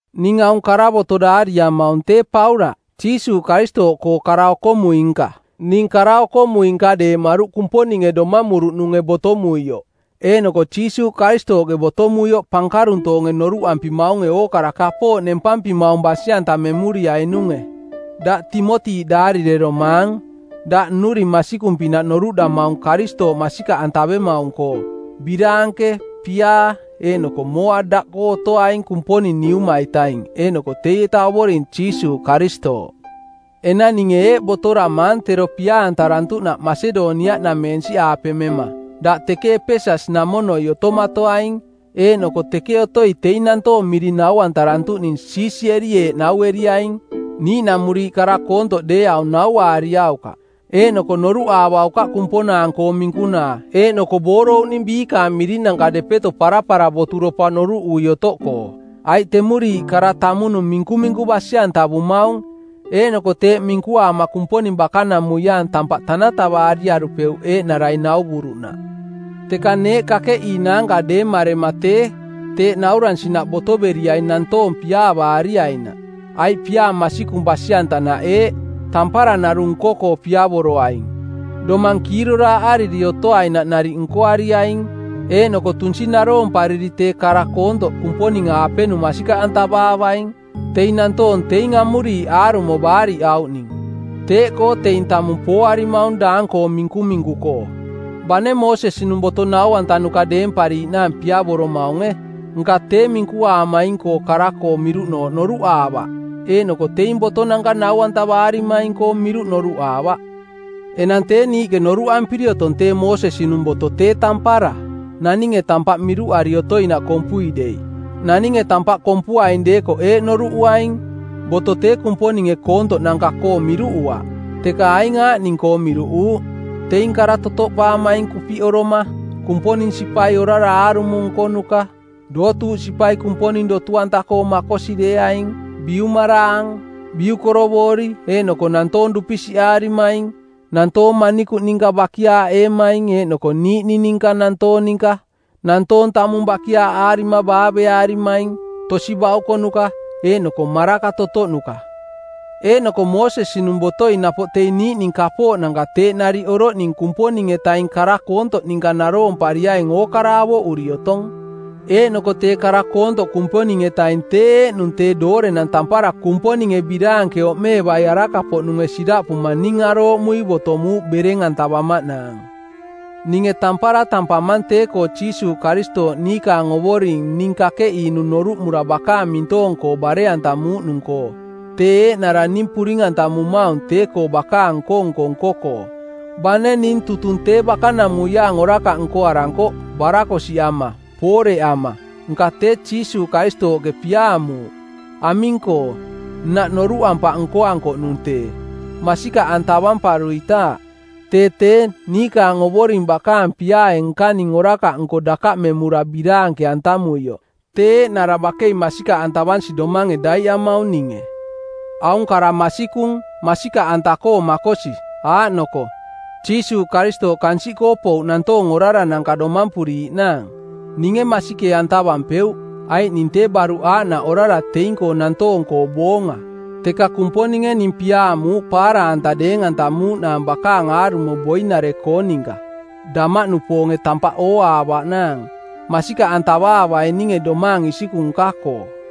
Ning aung karavoto˜ daariamaung tee Paulaꞌ, Jiisuuꞌ Karistooꞌkoo kara-okomui-nka. Ning kara-okomui-nka deemaruꞌ Kumponinge domamuruꞌnunge botomuioꞌ eeꞌnoko Jiisuuꞌ Karistooꞌke botomuioꞌ pankaruntoonge noruꞌampimaunge ookara kapooꞌ nempampimaung basi-antamemuriainunge. Daꞌ Timoti daarireromaang; daꞌ nnuring masikung-pinaꞌ noruꞌdamaung Karistooꞌ masikaꞌantavemaung-koo. Biraanke, piaa, eeꞌnoko mooa daꞌkoo otoaing Kumponing Neuma-itaing eeꞌnoko teieta Ovoring Jiisuuꞌ Karistooꞌ. Enang ninge eeꞌ botoramaang tero pia-antarantuꞌnaꞌ Masedoniaꞌnameensiꞌaape mema: Daꞌ teke Epeses-namonoi otomatoaing, eeꞌnoko teke otoi teing nantoong miring naurantuꞌning siisieri eeꞌ naueriaing: Niiꞌnamuriiꞌ kara koontoꞌ deeaung nauaariaukaꞌ. Eeꞌnoko noruꞌaavaukaꞌ kumponaang-koong minkunaa eeꞌnoko boorouꞌning biikaang mirinanka depeto parapara boturopa noruꞌui otoꞌkoo. Aiꞌ temuriiꞌ kara tamunung minkuminku basi-antavumaung, eeꞌnoko teeꞌ minkuaama Kumponing bakanamuiaang tampaꞌ tanatavaariarupeuꞌ eeꞌnarai nauvuruꞌnaꞌ. Teka neeꞌ kakeꞌiinaanka deemarema tee, teeꞌ nauransinaꞌ botoveriaing nantoong piaavaariainaꞌ. Aiꞌ piaa masikung basi-antanaꞌ eeꞌ: Tampara narung nko-koo piavoroaing; domang kiiroraaꞌariri otoainaꞌ nariꞌ nkoariaing; eeꞌnoko tunsi naroompariri tee kara koontoꞌ Kumponing-aapenung masikaꞌantavaavaing. Teing nantoong teing amuriiꞌ aarumo baariꞌauꞌning. Teeꞌkoo teing tamung pooarimaung daang-koong minkuminku-koo. Bane Moosesi-nung boto nau-antanuka deempariiꞌnaang piavoromaunge, nka tee minkuaamaing-koo kara-koo miruꞌnooꞌ noruꞌaavaꞌ eeꞌnoko teing botonanka nau-antavarimaing-koong miruꞌ noruꞌaavaꞌ. Enang tee niiꞌke noruꞌampiri otong tee Moosesi-nung boto tee tampara, naninge tampaꞌ miruꞌari otoinaꞌ kompui dei. Naninge tampaꞌ kompuaing deekoꞌ eeꞌ noruꞌuaing: Boto tee Kumponinge koontoꞌnanka-koo miruꞌuaꞌ, teka aing aaꞌning-koo miruꞌuuꞌ: teing kara totoꞌpaamaing kupiꞌoroma, Kumponing sipai orara aarumo nkonuka, dootuuꞌ sipai Kumponing dotu-anta-koo makosi deeaing, biumaraang, biukorovoori eeꞌnoko nantoong dupisiꞌaarimaing, nantoong manikuꞌ ninka bakiaaꞌeemaing eeꞌnoko niiꞌning ninka nantoong ninka, nantoong tamung bakiaaꞌaarima baaveaarimaing, tosi baukonuka, eeꞌnoko maraka totoꞌnuka; Eeꞌnoko Moosesi-nung botoi napoꞌ teing niiꞌning kapooꞌnanka teeꞌ nariꞌ oroꞌning Kumponing-etaing kara koontoꞌ ninka naroompariaing ookara avoꞌuri otong. Eeꞌnoko tee kara koontoꞌ Kumponing-etaing tee eeꞌnung tee doorenang tampara Kumponinge biraanke oꞌmeevai araka-poꞌnunge siraꞌpuma ning arooꞌmui botomuuꞌ bereng-antavamaꞌnaang. Ninge tampara tampamang tee-koo Jiisuuꞌ Karistooꞌ niikaang Ovoring ning kakeꞌiinung noruꞌmura bakaang mintoong-koo bare-antamuuꞌnung-koo. Tee eeꞌnara ning puring-antamumaung tee-koo bakaang nko-nko nko-koo. Bane ning tutung tee bakanamuiaang orakaꞌ nkoarankoꞌ, barakosiꞌama, pooreꞌama, nka tee Jiisuuꞌ Karistooꞌke piaamuuꞌ. Aming-koo? Nnaꞌ noruꞌampaꞌ nkoankoꞌnung tee, masikaꞌantavamparuitaaꞌ; Tee tee, niikaang Ovoring bakaang piaae nkaning orakaꞌnko dakaꞌmemura biraanke-antamuioꞌ, tee eeꞌnara bakei masikaꞌantavansi domange daiꞌamaung ninge. Aung kara masikung, masikaꞌanta-koo makosi, aaꞌnoko, “Jiisuuꞌ Karistooꞌ kansiꞌkoo pouꞌ nantoong orarananka domampuriiꞌnaang.” Ninge masikee-antavampeuꞌ, aiꞌ ning tee baruꞌ aaꞌnaꞌ orara teing-koo nantoong-koo boonga. Teka Kumponinge ning piaamuuꞌ paara-anta deeng-antamuuꞌnaang bakaang aarumo boinare-koong ninka, damaꞌnupoonge tampaꞌ ooaavaꞌnaang, masikaꞌantavaavaiaininge domaang isikung nka-koo.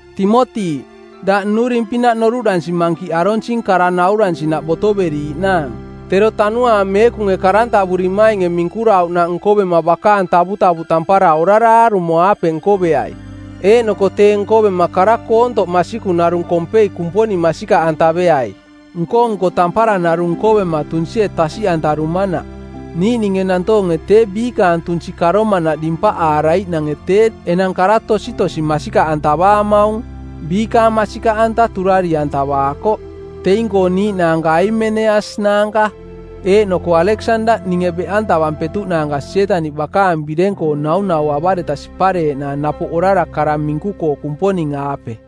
Timoti, daꞌ nnuring-pinaꞌ noruꞌdansi mankiꞌ aronsing kara nauransinaꞌ botoveriiꞌnaang. Tero Tanuaang Meekunge karantavurimainge˜ minkurauꞌnaꞌ nkovema bakaang tavutavuꞌ tampara orara aarumo-aape nkoveai. Eeꞌnoko tee nkovema kara koontoꞌ masikung narung kompei Kumponing masikaꞌantaveai, nko-nko tampara narung nkovema tunsie tasiꞌantarumanaꞌ. Niiꞌninge nantoonge tee biikaang tunsi karomanaꞌ dimpaꞌaaraiꞌnange tee enang kara tositosi masikaꞌantavaamaung. Biikaang masikaꞌanta turari-antavaakoꞌ. Teing-koo niiꞌnaanka Aimeneas naanka eeꞌnoko Aleksandaꞌ ninge beꞌantavampetuꞌnaanka Sietaniꞌ bakaang bireng-koo naunauavareta sipareeꞌnaang napoꞌ orara kara minku-koo Kumponing-aape.